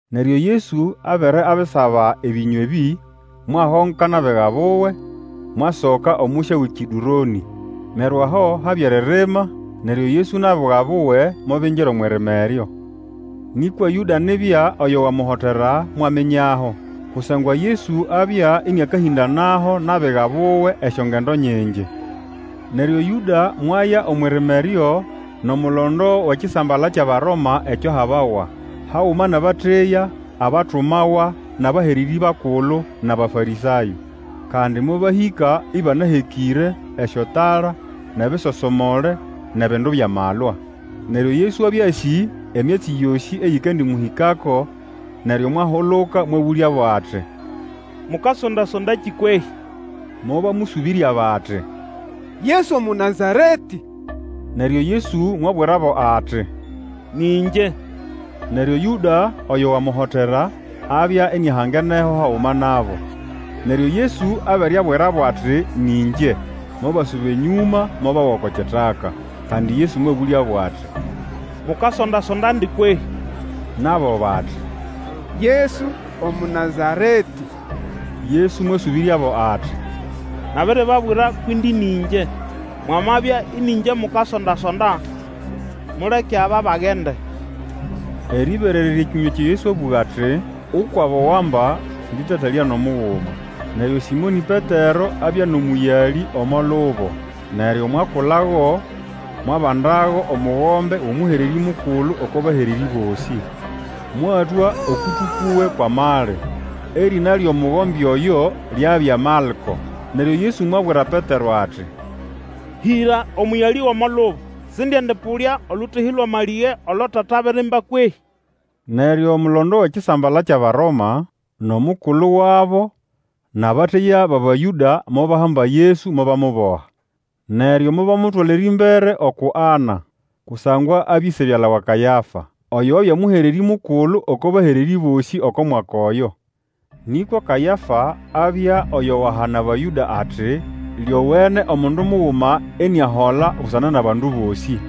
Neryo Yesu abere abisaba ebĩnywa ebĩ, mwahongoka nʼabiga buwe, mwasoka omusya wʼeKĩdũronĩ. Neryo aho habya eririma, neryo Yesu nʼabiga buwe mobingira omwʼirima eryo. Nĩkwa Yũda nibya oyo wamuhotera, mwaminyaho, kusangwa Yesu abya ĩnĩakahĩndanaho nʼabiga buwe esyongendo nyingi. Neryo Yũda mwaya omwʼirima eryo nʼomulondo wʼekisambala kyʼAbaroma ekyo ahabawa, haguma nʼabateya abatumawa nʼabahererĩ bakulu nʼAbafarĩsayo. Kandi mobahĩka ĩbanahekĩre esyotala, nʼebisosomole, nʼebindu byʼamalwa. Neryo Yesu abya asĩ emyatsi yosĩ eyikandĩmũhĩkako, neryo mwahuluka mwabũlyabo ati, Mukasonda-sondandi kwehĩ? Mobamũsũbĩrya bati, Yesu Omũnazaretĩ. Neryo Yesu mwabwirabo ati, Nĩ ĩngye! Neryo Yũda oyo wamuhotera, abya iniahangeneho haguma nabo. Neryo Yesu abere abwirabo ati, Nĩ ĩngye, mobasuba enyũma mobawa oko kitaka. Kandi Yesu mwabũlyabo ati, Mukasondasondandi kwehĩ? Nabo bati, Yesu Omũnazaretĩ. Yesu mwasũbĩryabo ati, Nabiribabwira kwʼindi nĩ ĩngye. Mwamabya ĩnĩ ĩngye mukasonda-sonda, muleke aba bagende. Erĩberererya ekĩnywa ekyo Yesu abũga ati, ukwʼabo wamba sĩndĩtatalya nʼomuguma. Neryo Sĩmonĩ Petero abya nʼomũyalĩ omo lubo. Neryo mwakulago, mwabandago omugombe wʼomũhererĩ Mukulu oko bahererĩ bosĩ, mwatwa okũtũ kuwe kwʼamali. Erĩna lyʼomugombe oyo lyabya Malko. Neryo Yesu mwabwira Petero ati, Hĩra omũyalĩ gʼomo lubo. Sindiendĩpũlya olũtehĩ lwʼamalĩge olo Tata abirimba kwehĩ? Neryo omulondo wʼekisambala kyʼAbaroma, nʼomukulu wabo nʼabateya bʼAbayũda, mobahamba Yesu mobamuboha. Neryo mobamutwala erĩmbere uku Ana, kusangwa abya ĩse-byala wa Kayafa, oyo wabya Mũhererĩ Mukulu oko bahererĩ bosĩ oko mwaka oyo. Nĩkwa Kayafa abya oyo wahana Abayũda ati, Lyowene omundu muguma iniahola busana nʼabandu bosĩ.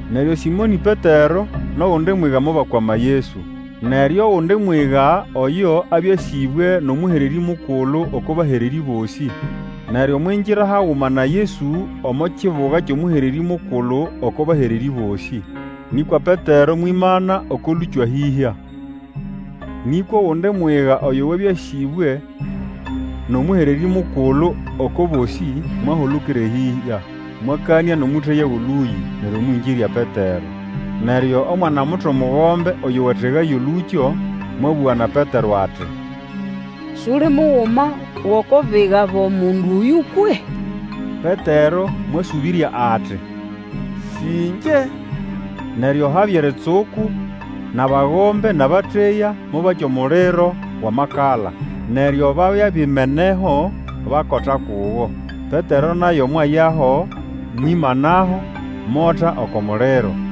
Neryo Sĩmonĩ Petero, nʼogundi mwiga mobakwama Yesu. Neryo ogundi mwiga oyo abya asĩbwe nʼomũhererĩ Mukulu oko bahererĩ bosĩ, neryo mwingira haguma na Yesu omo kibuga kyʼomũhererĩ Mukulu oko bahererĩ bosĩ. Nĩkwa Petero mwimana oko lũkyo ahĩhya. Nĩkwa ogundi mwiga oyo wabya asĩbwe nʼomũhererĩ Mukulu oko bosĩ, mwahulukira eyĩhya, mwakanĩa nʼomũteya wʼolũyĩ, neryo mwĩngĩrya Petero. Neryo omwana-muto mugombe oyo wategaya olũkyo, mwabũga na Petero ati, Suli muguma gʼoko biga bʼomundu oyũ kwehĩ? Petero mwasũbĩrya ati, Sĩ ĩngye! Neryo habya eritsuku, nʼabagombe nʼabateya mobakya omuliro wʼamakala, neryo babya bimeneho bakota kugo. Petero naye mwayaho, mwimanaho, mota oko muliro.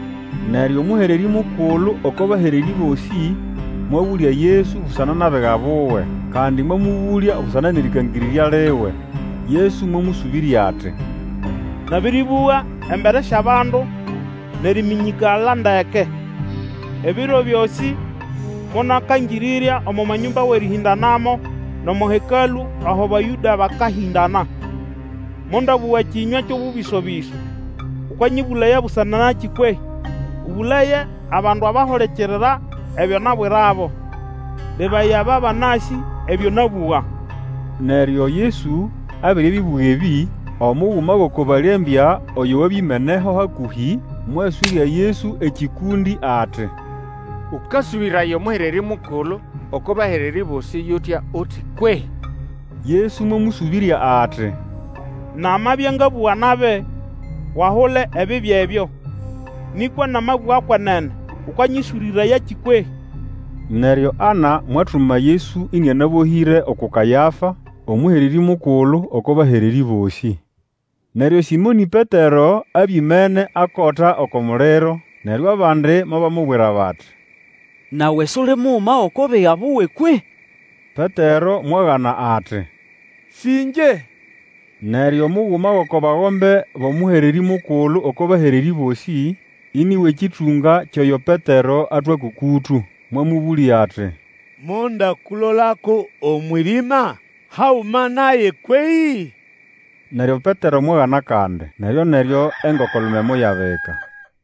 Neryo Omũhererĩ Mukulu oko bahererĩ bosĩ mwabũlya Yesu busana nʼabiga buwe, kandi mwamũbũlya busana nʼerikangĩrĩrya liwe. Yesu mwamũsũbĩrya ati, Nabĩrĩbũga embere syʼabandu nʼeriminyikala ndeke. Ebiro byosĩ monakangĩrĩrya omo manyũmba wʼerĩhĩndanamo, nʼomo Hekalũ aho Abayũda bakahĩndana. Mondabũga kĩnywa kyʼobũbĩso-bĩso. Ukanyĩbũlaya busana nakĩ kwehĩ? Ũbũlaye abandu abahulikirira ebyo nabwirabo. Lebaya, aba banasĩ ebyo nabũga. Neryo Yesu abere abibũga ebĩ, omuguma gʼoko balembya oyo wabya imeneho hakũhĩ, mwaswĩrya Yesu ekĩkũndĩ ati, Ũkasũbĩraya Omũhererĩ Mukulu oko bahererĩ bosĩ yʼutya uti kwehĩ? Yesu mwamũsũbĩrya ati, Namabya ngabũga nabi, Wahule ebibi ebyo. Nĩkwa namabũga kwenene, ũkanyĩswĩrĩrayakĩ kwehĩ? Neryo Ana mwatuma Yesu ĩnĩanabohĩre, uku Kayafa, Omũhererĩ Mukulu oko bahererĩ bosĩ. Neryo Sĩmonĩ Petero abya imene akota oko muliro, Neryo abandi mobamubwira bati, Nawe suli muguma gʼoko biga buwe kwehĩ? Petero mwagana ati, Sĩ ĩngye. Neryo omuguma gʼoko bagombe bʼomũhererĩ Mukulu oko bahererĩ bosĩ, ini wʼekĩtũnga kyʼoyo Petero atwa kwʼokũtũ, mwamũbũlya ati, Mondakulolako omwʼirima haguma naye kwehĩ? Neryo Petero mwagana kandi. Neryoneryo engoko-lume moyabika.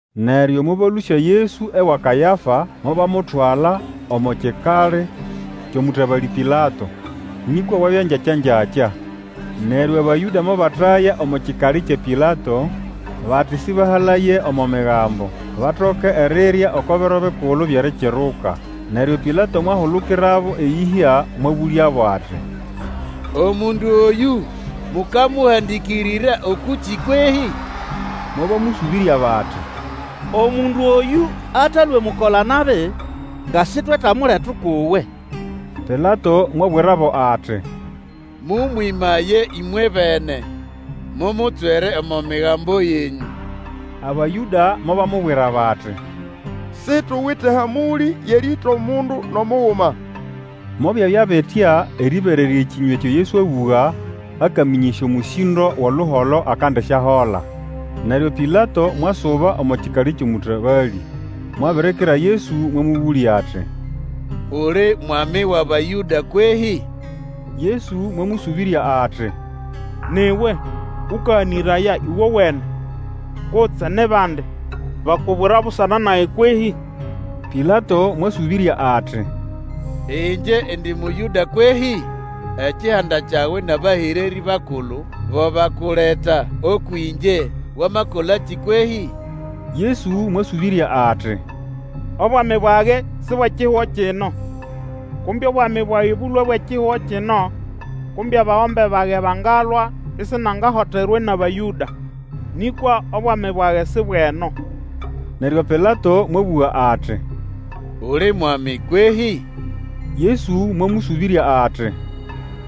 Neryo mobalũsya Yesu ewa Kayafa, mobamutwala omo kikali kyʼomũtabalĩ Pilato. Nĩkwa bwabya ngyakyangyakya. Neryo Abayũda mobataya omo kikali kya Pilato bati sĩbahalaye omo Migambo, batoke erirya oko Biro Bikulu byʼErikiruka. Neryo Pilato mwahulukirabo eyĩhya, mwabũlyabo ati, Omundu oyũ, mukamuhandikirira ũkũkĩ kwehĩ? Mobamũsũbĩrya bati, Omundu oyũ atalwe mukola-nabi nga sitwetamuleta ukʼuwe. Pilato mwabwirabo ati, Mũmwĩmaye ĩmwebene, mumutswere omo migambo yenyũ. Abayũda mobamubwira bati, Situwite hamũlĩ yʼerĩĩta omundu nʼomuguma. Mobyabya bitya erĩberererya ekinywa ekyo Yesu abũga akamĩnyĩsya omũsĩndo wʼoluholo akandisyahola. Neryo Pilato mwasuba omo kikali kyʼomũtabalĩ, mwabirikira Yesu, mwamũbũlya ati, Uli mwami wʼAbayũda kwehĩ? Yesu mwamũsũbĩrya ati, Ni iwe Ũkaganĩraya uwowene, kutse ni bandi bakubwira busana nage kwehĩ? Pilato mwasũbĩrya ati, Ĩngye indi Mũyũda kwehĩ? Ekihanda kyawe nʼabahererĩ bakulu bo bakuleta ũkwʼĩngye; wamakolakĩ kwehĩ? Yesu mwasũbĩrya ati, Obwami bwage si bwʼekihugo kino. Kumbe obwami bwage bũlwe bwʼekihugo kino, kumbe abagombe bage bangalwa isinangahoterwa nʼAbayũda. Nĩkwa obwami bwage si bwʼeno. Neryo Pilato mwabũga ati, Uli mwami kwehĩ? Yesu mwamũsũbĩrya ati,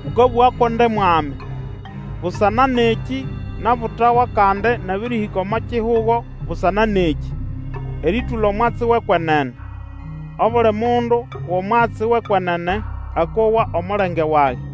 Ũkabũga ko ndi mwami. Busana nʼekĩ nabutawa kandi nabĩrĩhĩka omo kihugo busana nʼekĩ, erĩtũla omwatsi wʼekwenene. Obuli mundu wʼomwatsi wʼekwenene akowa omulenge wage.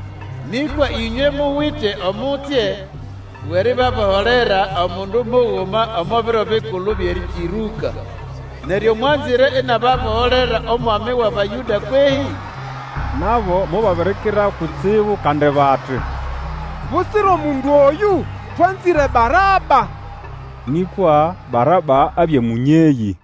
Nĩkwa ĩnywe muwite omutsye wʼeribaboholerwa omundu muguma omo Biro Bikulu byʼErikiruka. Neryo mwanzĩre inababoholera Omwami wʼAbayũda kwehĩ? Nabo mobabirikira kutsibu kandi bati, Butsira omundu oyũ, twanzĩre Baraba. Nĩkwa Baraba abya mũnyeyĩ.